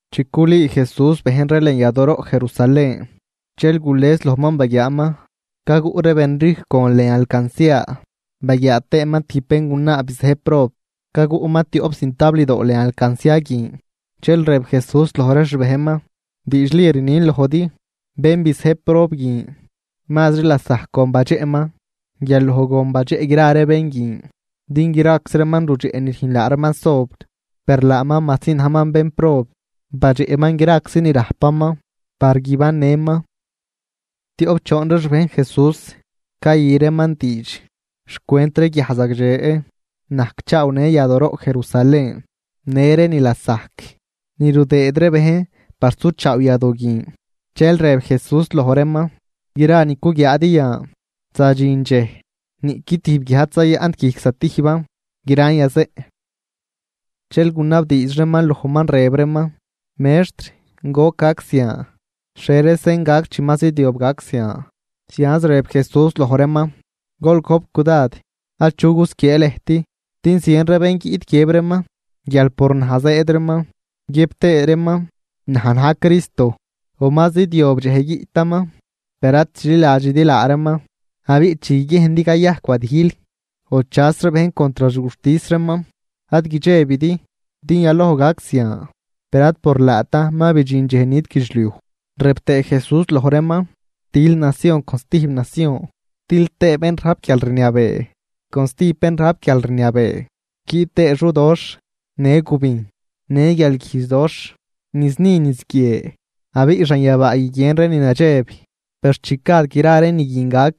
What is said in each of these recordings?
Chi culüü Jesús bejn ree lën yadooroꞌ Jerusalén, dxel gules lojman baguiaaman caguꞌ ree benrijcw gon lën alcancia. Baguiaa tëëman tijb béngunaa bizëjb prob, caguꞌman tioꞌp cintabldoo lën alcancia guin. Dxel rëb Jesús loj ree xbejnman: ―Diidxli rnin lojdi guial bén bizëjb prob guin mazri lasajc gon badxeꞌman guial loj gon badxeꞌ gra ree bén guin. Din graczi reeman rudxeꞌ ni rüjn laa reeman sobr, per laaman majsi najman bénprob, badxeꞌman graczi ni rajpaman par guibannëman. Tioꞌp choon ree xbejn Jesús cayü reeman diidx xcwent ree guiaj zagdxe najcchaawnë yadooroꞌ Jerusalén, në ree ni lasajc ni rudëëd ree bejn par suchaaw yadoo guin. Dxel rëb Jesús loj reeman: ―Gra ni cuguiaadi yan, zadxin dxej niꞌqui tijb guiaj ad zayaꞌnt guijc stijban, gran yazeꞌn. Dxel gunabdiidx reeman lojman rëb reeman: ―Mextr, ¿goc gac zian? ¿Xhie ree sen gac chi ma zidyob gac zian? Zianz rëb Jesús loj reeman: ―Gol gojp cudad achu gusquiee lëjt. Din zien ree bén guiꞌt guiëb reeman guial por naj zëëd reeman guiëb tëë reeman: “Naj na̱j Cristo”; o “Ma zidyob dxej guiꞌtaman.” Per ad chililadxidi laa reeman. Abiꞌ chi guiguiejndi cayajc wadijl o chas ree bejn contr xguxtis reeman, ad guidxebidi din yaloj gac zian. Per ad por laatan ma bidxin dxej nit guidxliuj. Rëb tëë Jesús loj reeman: ―Til nacion con stijb nacion, til tëë bén rajp guialrniabee con stijb bén rajp guialrniabee, guiꞌt tëë xudoxh, në gubijn, në guialguijdxdoxh niz ni niz guie abiꞌ xanyabaa guiguien ree ni nadxeb. ’Per chi gad gra ree ni guin gac,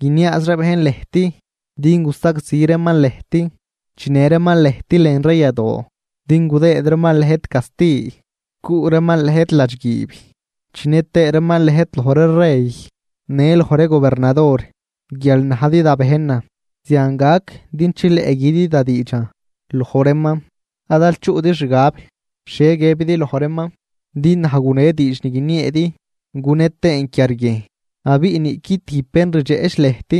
guiniaaz ree bejn lëjt din gusagzi reeman lëjt, chinë reeman lëjt lën ree yadoo din gudëëd reeman lëjt casti, cuꞌ reeman lëjt ladxguiib chinë tëë reeman lëjt loj ree rey në loj ree gobernador guial najdi da bejnan. Zian gac din chileꞌ güdi da diidxan loj reeman. Ad aal chuꞌdi xgab xhie guiëbidi loj reeman. Din naj gune diidx ni guinieedi gune tëën quiarguiejn. Abiꞌ niꞌqui tijb bén rdxeꞌch lëjt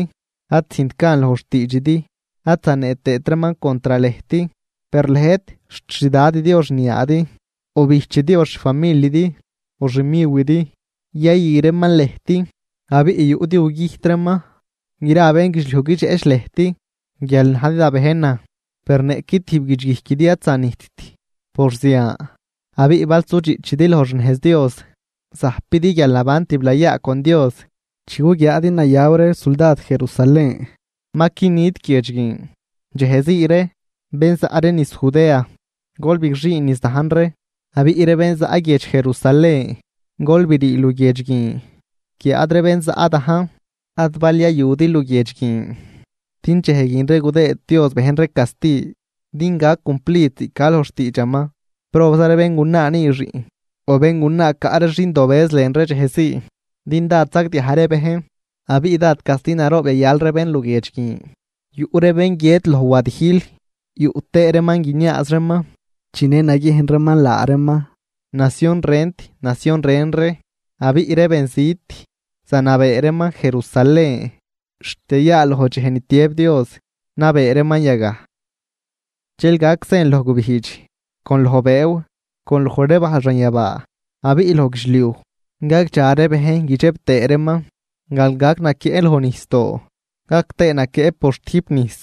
ad züjnt gan loj xtiidxidi ad zanee tëët reeman contr lëjt. Per lëjt xt xdadidi o xniaadi, o bijchidi o xfamilidi o xmiwidi yayü reeman lëjt, abiꞌ yuꞌdi gugüjt reeman. Gra bénguidxliuj guidxeꞌch lëjt guial najdi da bejnan. Per niꞌqui tijb guidxguijquidi ad zanijtt por zian. Abiꞌ bal sudxiꞌchidi loj xnejz Dios, zajpidi guialnaban tiblayaa con Dios. ’Chi guguiaadi nayaw ree suldad Jerusalén, ma qui nit guiedx guin. Dxejzii ree, bén zaꞌ ree niz Judea, gol bigxüün niz dajn ree, abiꞌ ree bén zaꞌ guiedx Jerusalén gol brii luguiedx guin, guiáad ree bén zaꞌ dajn ad bal yayudi luguiedx guin. Din dxej guin ree gudëëd Dios bejn ree casti din gac cumplid ziꞌc ca loj xtiidxaman. ¡Probza ree béngunaa nüü xiꞌn o béngunaa caꞌ ree xindobëz lën ree dxejzii! Din dád sagdiaj ree bejn abiꞌ dád casti naroob yayal ree bénluguiedx guin. Yuꞌ ree bén guiët loj wadijl yuꞌ tëë reeman guiniaaz reeman chinë naguiejn reeman laa reeman nacion rent nacion ren ree. Abiꞌ ree benzit zanabee reeman Jerusalén xt yayaaloj dxej ni tiëb Dios nabee reeman yagaj. ’Dxel gac sen loj gubijdx, con loj bëëw, con loj ree bajl xanyabaa. Abiꞌ loj guidxliuj gagdxa ree bejn guidxeb tëë reeman guial gac naquieꞌ loj nijsdoo gac tëë naquieꞌ por xtüjp nijs.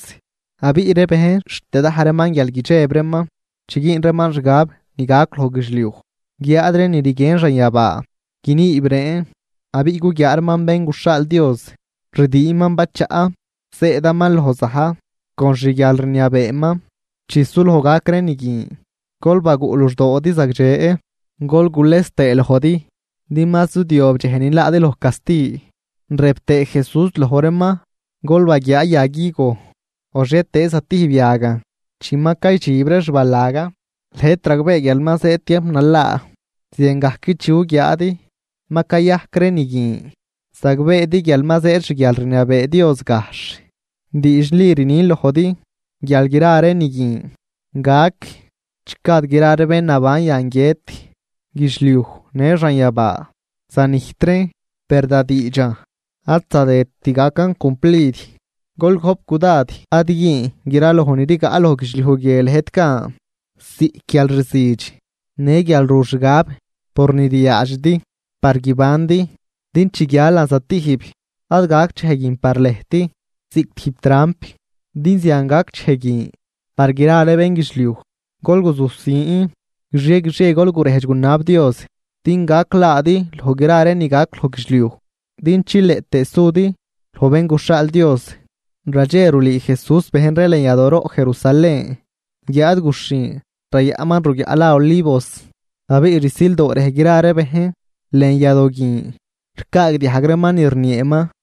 Abiꞌ ree bejn xt yadaj reeman guial guidxeb reeman chi güün reeman xgab ni gac loj guidxliuj, guiáad ree ni rguien xanyabaa guiniib reen. Abiꞌ guguiaa reeman Bén guxhaal Dios, rdiinman bachaꞌ zëëdaman loj za̱j con xguialrniabeeman. Chi suloj gac ree ni guin, gol baguꞌ luxdoodi zagdxe gol gules tëë lojdi din ma zidyob dxej ni laadi loj casti. Rëb tëë Jesús loj reeman: ―Gol baguiaa yag higo o xhietëëz zatijb yagan. Chi ma caydxib ree xbalagan, lëjt ragbee guial ma zëëd tiamp nalaa. Ziangajc chi guguiaadi ma cayajc ree ni guin, zagbeedi guial ma zëëd xguialrniabee Dios gajxh. ’Diidxli rnin lojdi guial gra ree ni guin gac chi gad gra ree bén naban yan guiët. Guidxliuj në xanyabaa zanijt reen, per da diidxan ad zadëdt gacan cumplid. ’Gol gojp cudad ad güün graloj ni rigaꞌ loj guidxliuj guie lëjt gan, ziꞌc guial rzüdx, në guial ru xgab por ni ryaadxidi par guibandi din chi guialan zatijb, ad gac dxej guin par lëjt ziꞌc tijb tramp. Din zian gac dxej guin par gra ree bénguidxliuj. Gol guzujsin, guixie guixie gol gurejdx gunab Dios din gac laadi loj gra ree ni gac loj guidxliuj din chileꞌ tëë sudi loj Bén guxhaal Dios. Radxe rulüü Jesús bejn ree lën yadooroꞌ Jerusalén guiáad guxhin rayaꞌnman ruguiaꞌ la Olivos. Abiꞌ rsildoo rej gra ree bejn lën yadoo guin ricaagdiajg reeman ni rnieeman.